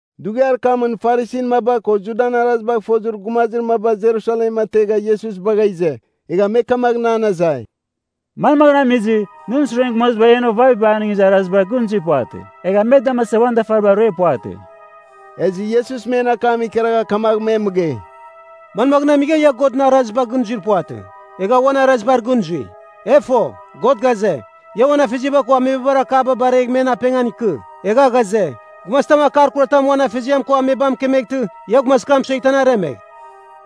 Dughiar kamɨn Farisin maba ko Judan arazibagh fozir gumazir maba Jerusalem ategha Iesus bagha ize. Egha me kamagh an azai, “Manmaghɨn amizɨ, nɨn suren gumaziba en ovaviba anɨngzir arazibar gɨn zuir puvatɨ? Egha me damasa uan dafariba ruer puvatɨ.” Ezɨ Iesus men akam ikaragha kamagh me mɨgei, “Manmagh amigha ia Godɨn arazibar gɨn zuir puvatɨ, egha uan arazibar gɨn zui? E fo, God ghaze, ‘Ia uan afeziaba ko amebabar akaba baregh men apengan ikɨ’, egha ghaze, ‘Gumazitam akar kuratam uan afeziam ko amebam mɨkemeghtɨ, ia gumazir kam mɨsueghtɨ, an aremegh.’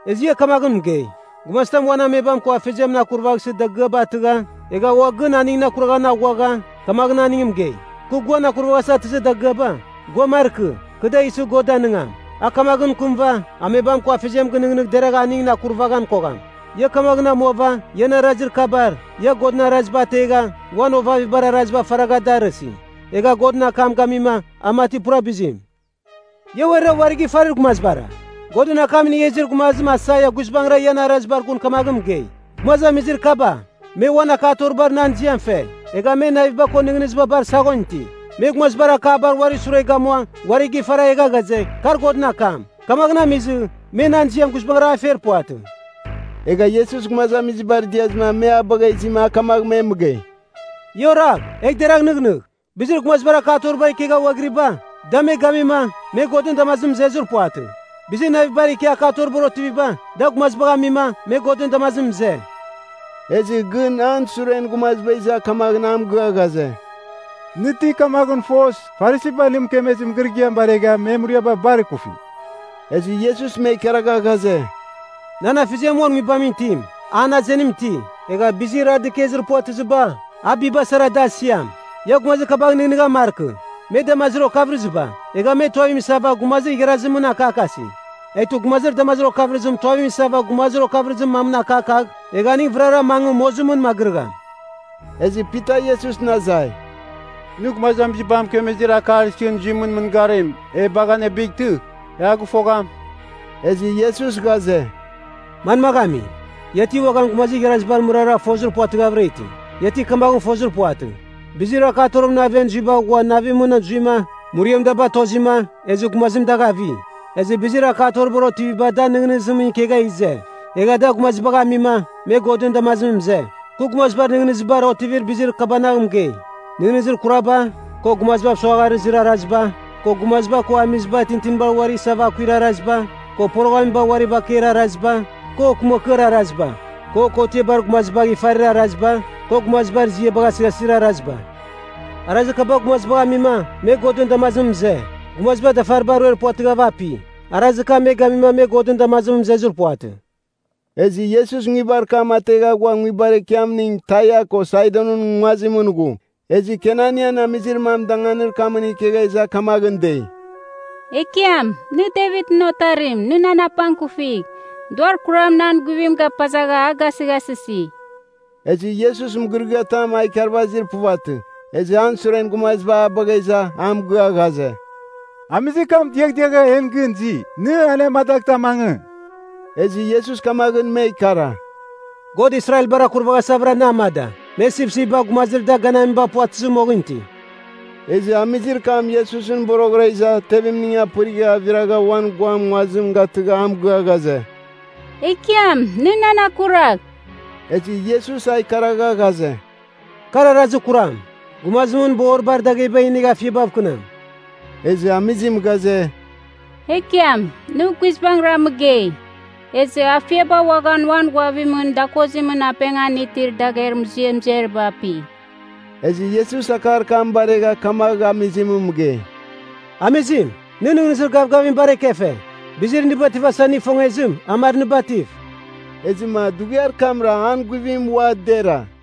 Ezɨ ia kamaghɨn mɨgei, ‘Gumazitam uan amebam ko afeziamɨn akurvaghsɨ dagɨaba atɨgha, egha ua gɨn aningɨn akuraghan aghuagha, kamaghɨn aning mɨgei, “Kɨ guan akuraghasa atɨzir dagɨaba, gua markɨ. Kɨ da isɨ God danɨngam.” ’ A kamaghɨn mɨkɨmɨva, amebam ko afeziam gɨnɨghnɨgh deragh aningɨn akurvaghan kogham. Ia kamaghɨn amuava, ian arazir kabar, ia Godɨn araziba ategha, uan ovavibar araziba faragha darɨsi. Egha Godɨn akam gamima, a mati pura bizim.” Ia uarira uarigh gifarir gumazibara! Godɨn akam inigha izezir gumazim Aisaia guizbangɨra ian arazibar gun kamaghɨn mɨgei, “Gumazamizir kaba, me uan akatoribar nan ziam fe, egha men naviba ko nɨghnɨziba bar saghon iti. Me gumazibar akabar uari sure gamua uari gifara egha ghaze, kar Godɨn akam. Kamaghɨn amizɨ, me nan ziam guizbangɨra a fer puvatɨ.” Egha Iesus gumazamizibar diazɨma me a bagha izima a kamaghɨn me mɨgei, “Ia oragh, egh deragh nɨghnɨgh! Bizir gumazibar akatoribar ikegha ghuaghiriba, da me gamima, me Godɨn damazimɨn mɨzezir puvatɨ. Bizir navibar ikia akatoribar otiviba, da gumazibagh amima, me Godɨn damazimɨn mɨze.” Ezɨ gɨn an suren gumaziba iza kamaghɨn a mɨgɨa ghaze, “Nɨ ti kamaghɨn fos, Farisiba nɨ mɨkemezir mɨgɨrɨgɨam baregha men muriaba bar ikufi?” Ezɨ Iesus me ikaragha ghaze, “Nan afeziar uan Nguibamɨn itim, an azenim iti. Egha bizir a dɨkezir puvatɨziba, a biba sara da asiam. Ia gumazir kabagh nɨghnɨghan markɨ. Me damazir okavɨrɨziba, egha me tuavim isava gumazir igharazimɨn akakasi. Eghtɨ gumazir damazir okavɨrɨzim tuavim isava gumazir okavɨrɨzir mamɨn akakagh, egh aning vɨrara mangɨ mozimɨn magɨrɨgham.” Ezɨ Pita Iesusɨn azai, “Nɨ gumazamiziba mɨkemezir akar isɨn zuimɨn mɨngarim e bagh anebightɨ, e a gɨfogham?” Ezɨ Iesus ghaze, “Manmagh ami, ia ti uaghan gumazir igharazibar mɨrara fozir puvatɨghavɨra iti.” Ia ti kamaghɨn fozir puvatɨ, bizir akatorimɨn aven zuiba ghua navimɨn zuima, muriam da batozima, ezɨ gumazim dagh avi. Ezɨ bizir akatoribar otiviba da nɨghnɨzimɨn ikegha ize. Egha da gumazibagh amima, me Godɨn damazimɨn mɨze. Kɨ gumazibar nɨghnɨzibar otivir bizir kabanagh mɨgei, nɨghnɨzir kuraba, ko gumaziba mɨsogharɨzir araziba, ko gumaziba ko amiziba tintinibar uari isava akuir araziba, ko poroghamiba uari bakeir araziba, ko okɨmakɨar araziba, ko kotiabar gumazibagh ifarir araziba, ko gumazibar ziabagh asɨghasɨzir araziba. Arazir kaba gumazibagh amima, me Godɨn damazimɨn mɨze. Gumaziba dafariba ruer puvatɨgha api, arazir kam me gamima me Godɨn damazimɨn mɨzezir puvatɨ. Ezɨ Iesus nguibar kam ategha ghua nguibar ekiamning Taia ko Saidonɨn nguazimɨn ghu. Ezɨ Kenanian amizir mam danganir kamɨn ikegha iza kamaghɨn dei, “Ekiam, nɨ Devitɨn Otarim, nɨ nan apangkuvigh! Duar kuram nan guivim gapazagha a gasɨghasɨsi.” Ezɨ Iesus mɨgɨrɨgɨatam a ikarvazir puvatɨ. Ezɨ an suren gumaziba a bagha iza a mɨgɨa ghaze, “Amizir kam dɨaghdiagha en gɨn izi. Nɨ anemadaghtɨ a mangɨ.” Ezɨ Iesus kamaghɨn me ikara, “God Israelbar akurvaghasavɨra na amada. Me sipsipba gumazir dar ganamiba puvatɨzɨ moghɨn iti.” Ezɨ amizir kam Iesusɨn boroghɨra iza, tevimning apɨrigha aviragha uan guam nguazim gatɨgha a mɨgɨa ghaze, “Ekiam, nɨ nan akuragh.” Ezɨ Iesus a ikaragha ghaze, “Kar arazir kuram, gumazimɨn boribar dagheba inigh afiabav kɨnam.” Ezɨ amizim ghaze, “Ekiam, nɨ guizbangɨra mɨgei. Ezɨ afiaba uaghan uan ghuavimɨn dakozimɨn apengan itir dagher muzemziariba api.” Ezɨ Iesus akar kam baregha kamagh amizim mɨgei, “Amizim, nɨn nɨghnɨzir gavgavim bar ekefe. Bizir nɨ bativasa nɨ ifongezim, a mar nɨ batif.” Ezɨma dughiar kamra an guivim ua dera.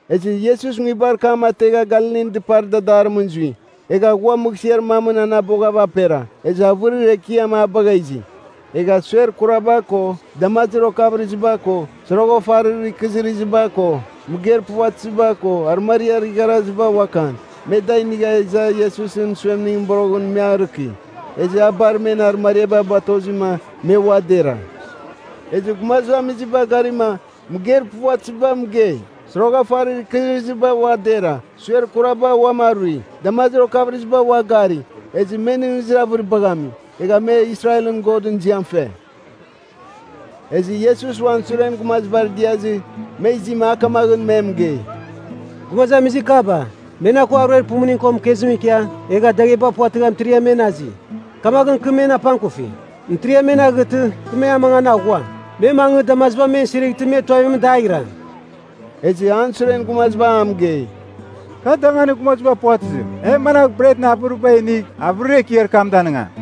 Ezɨ Iesus nguibar kam ategha Galilin dɨpar dadarimɨn zui. Egha ghua mɨghsɨar mamɨn anaboghava apera. Ezɨ avirir ekiam a bagha izi. Egha suer kurabar ko, damazir okavɨrɨziba ko, soroghafarir ikɨzɨrɨziba ko, mɨgeir puvatɨziba ko, arɨmariar igharaziba uaghan, me da inigha iza Iesusɨn suemningɨn boroghɨn me arɨki. Ezɨ a bar men arɨmariaba batozima, me ua dera. Ezɨ gumazamiziba garima, mɨgeir puvatɨziba mɨgei, soroghafarir ikɨzɨrɨziba ua dera, suer kuraba uam arui, damazir okavɨrɨziba ua gari, ezɨ me nɨghnɨzir avɨribagh ami. Egha me Israelɨn Godɨn ziam fe. Ezɨ Iesus uan suren gumazibar diazɨ, me izima a kamaghɨn me mɨgei, “Gumazamizir kaba, me na ko aruer pumuning ko mɨkezimɨn ikia, egha dagheba puvatɨgha mɨtiriam men azi, kamaghɨn kɨ men apangkufi. Mɨtiriam men aghɨtɨ, kɨ me amangan aghua. Me mangɨ damaziba men isirtɨ, me tuavimɨn dagh iram.” Ezɨ an suren gumaziba a mɨgei, “Kar danganir gumaziba puvatɨzim. E managh bretɨn avɨriba inigh avɨrir ekiar kam danɨngam?”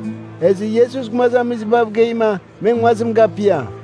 Ezɨ Iesus gumazamizibav geima, me nguazim gapia.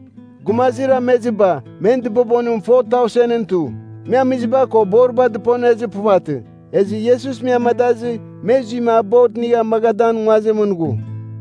Gumazir ameziba, men dɨbobonim 4,000ɨn tu. Me amiziba ko boriba dɨponezir puvatɨ. Ezɨ Iesus me amadazɨ, me zuima a bot inigha Magadan nguazimɨn ghu.